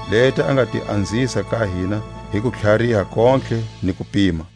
leti a nga ti anzisa ka hina hi kutlhariha kontlhe ni kupima.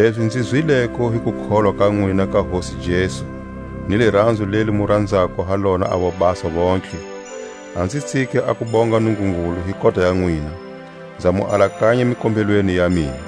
Lezi nzi zwileko hi kukholwa ka nwina ka Hosi Jesu, ni liranzo leli mu ranzako ha lona a vobasa vontlhe, a nzi tsiki a ku bonga Nungungulu hi kota ya nwina, nza mu alakanya mikombelweni ya mina.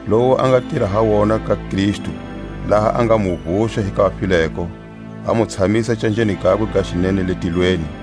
lowu a nga tira ha wona ka Kristu, laha a nga mu vuxa hi ka vafileko, a mu tshamisa canjeni gakwe ga xinene le tilweni,